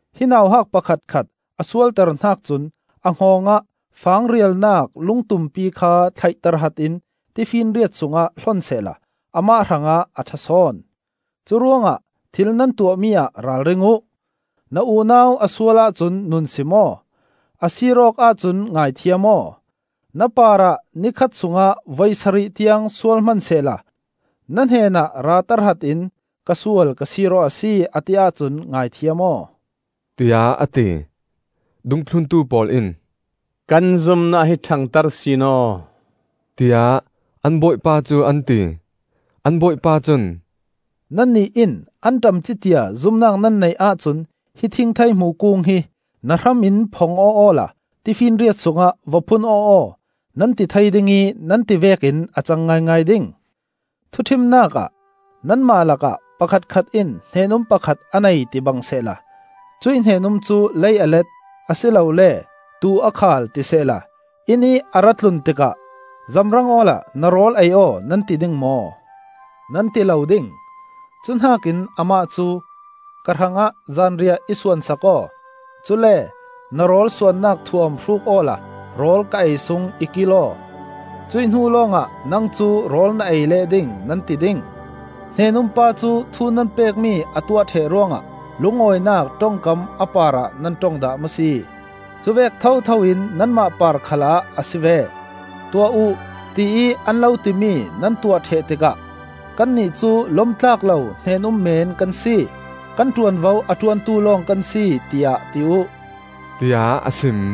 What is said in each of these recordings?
Hi nauhak pakhatkhat a sualter hnak cun a hngawng ah fang rialnak lungtumpi kha thlaih tahratin tifinriat sungah hlon sehla amah hrangah a ṭhasawn. Curuangah thil nan tuahmi ah ralring uh. Na unau a sual ahcun nunsim aw; a sir awk ahcun ngaithiam aw. Na parah ni khat sungah voi sarih tiang sual hmansehla na hnenah ra tahratin ‘Ka sual ka sir aw a si,’ a ti ahcun ngaithiam aw,” tiah a ti. Dungthluntu pawl in, “Kan zumnak hi ṭhangter sin aw,” tiah an Bawipa cu an ti. An Bawipa cun, “Nannih in anṭam ci tia zumnak nan neih ahcun hi thingtheihmu kung hi ‘Na hram in phong aw awla tifinriat sungah va phun aw aw,’ nan ti thei ding ih nan ti vekin a cang ngaingai ding. “Thuṭhimnak ah nanmah lakah pakhatkhat in hnen-um pakhat a nei tibang sehla, cuih hnen-um cu lei a let, a si lole tuu a khal ti sehla, innih a ra tlun tikah ‘Zamrang awla na rawl ei aw,’ nan ti ding maw? Nan ti lo ding! Cuhnakin amah cu ‘Ka hrangah zanriah i suan sak aw; cule na rawl suannak thuam hruk awla rawl ka ei sung i kil aw; cuih hnu lawngah nang cu rawl na ei leh ding,’ nan ti ding. Hnen-um pa cu thu nan pekmi a tuah ṭheh ruangah lungawinak ṭongkam a parah nan ṭong dah maw si? Cuvek thotho in nanmah par khal ah a si ve: tuah uh, tiih an lo timi nan tuah ṭheh tikah ‘Kannih cu lom tlak lo hnen-um men kan si. Kan ṭuanvo a ṭuantu lawng kan si,’ tiah ti uh,” tiah a sim.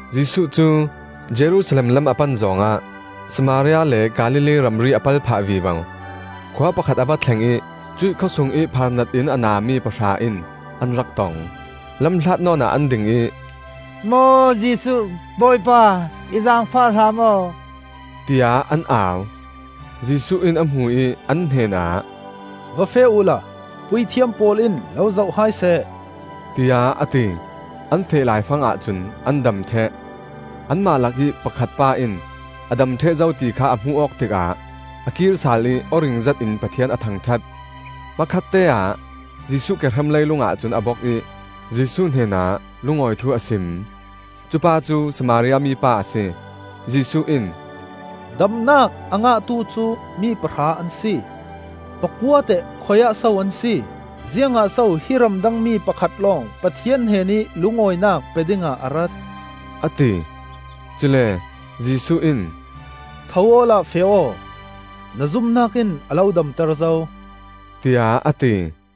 Jesuh cu Jerusalem lam a pan zawng ah Samaria le Galilee ramri a pal phah vivo. Khua pakhat a va thleng ih cuih khawsungih phaarnat in a nami pahra in an rak tong. Lamhlat nawnah an ding ih, “Maw Jesuh, Bawipa, in zaangfah hram aw,” tiah an au. Jesuh in a hmu ih an hnenah, “Va feh uhla puithiam pawl in lo zoh hai seh,” tiah a ti. An feh laifangah cun an dam ṭheh. Anmah lakih pakhat pa in a dam ṭheh zo ti kha a hmuh awk tikah a kirsal ih aw ring zetin Pathian a thangṭhat. Hmakhatteah Jesuh kehram leilungah cun a bok ih Jesuh hnenah lungawi thu a sim. Cupa cu Samaria mi pa a si. Jesuh in, “Damnak a ngahtu cu mi pahra an si. Pakua teh khui-ah so an si? Ziangah so hi ramdang mi pakhat lawng Pathian hnenih lungawinak pe dingah a rat?” a ti. Cule Jesuh in, “Tho awla feh aw. Na zumnak in a lo damter zo,” tiah a ti.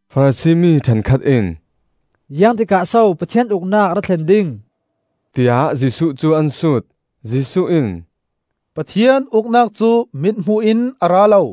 Farasi mi ṭhenkhat in, “Ziang tikah so Pathian Uknak a ra thlen ding?” tiah Jesuh cu an sut. Jesuh in, “Pathian Uknak cu mithmuh in a ra lo.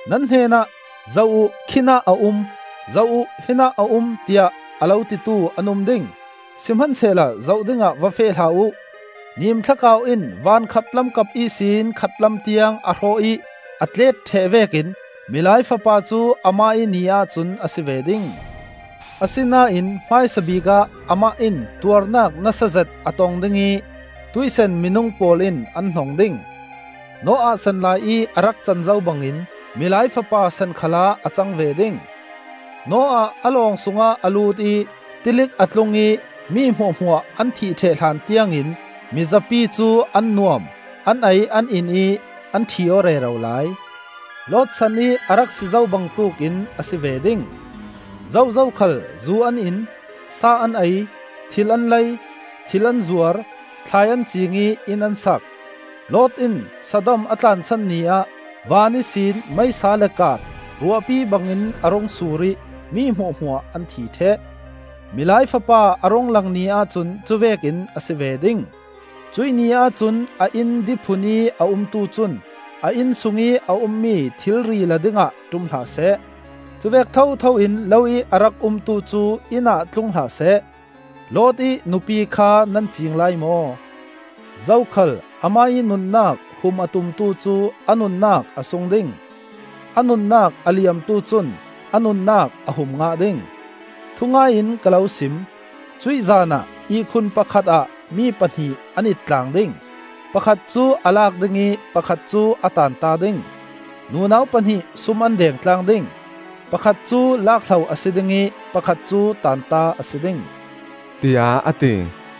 Nan hnenah ‘Zoh uh! Khinah a um! Zoh uh! Hinah a um!’ tiah a lo titu an um ding. Sihmansehla zoh dingah va feh hlah uh. Nimthlakau in van khatlam kap ihsin khatlam tiang a hrawh ih a tlet ṭheh vekin Milai Fapa cu amah ih ni ahcun a si ve ding. Asinain hmaisabik ah amah in tuarnak nasazet a tong ding ih tuihsan minung pawl in an hnong ding. Noah sanlai ih a rak can zo bangin Milai Fapa san khalah a cang ve ding. Noah a lawng sungah a lut ih tilik a tlung ih mi hmuahhmuah an thih ṭheh hlan tiangin mizapi cu an nuam, an ei an in ih an ṭhi aw rero lai. Lot sanih a rak si zo bangtuk in a si ve ding. Zozo khal zu an in, sa an ei; thil an lei, thil an zuar; thlai an ciing ih inn an sak. Lot in Sodom a tlansan ni ah van ihsin meisa le kaat ruahpi bangin a rung sur ih mi hmuahhmuah an thi ṭheh. Milai Fapa a rung lang ni ahcun cuvek in a si ve ding. Cuih ni ahcun a inn diphun ih a umtu cun a innsungih a ummi thilri la dingah ṭum hlah seh. Cuvek thothoin lo ih a rak umtu cu inn ah tlung hlah seh. Lot ih nupi kha nan ciing lai maw? Zokhal amah ih nunnak hum a tumtu cu a nunnak a sung ding; a nunnak a liamtu cun a nunnak a hum ngah ding. Thungai in ka lo sim: cuih zaan ah ihkhun pakhat ah mi pahnih an ittlang ding; pakhat cu a lak ding ih pakhat cu a taanta ding. Nunau pahnih sum an deng tlang ding; pakhat cu lak hlo a si ding ih pakhat cu taanta a si ding,” tiah a ti.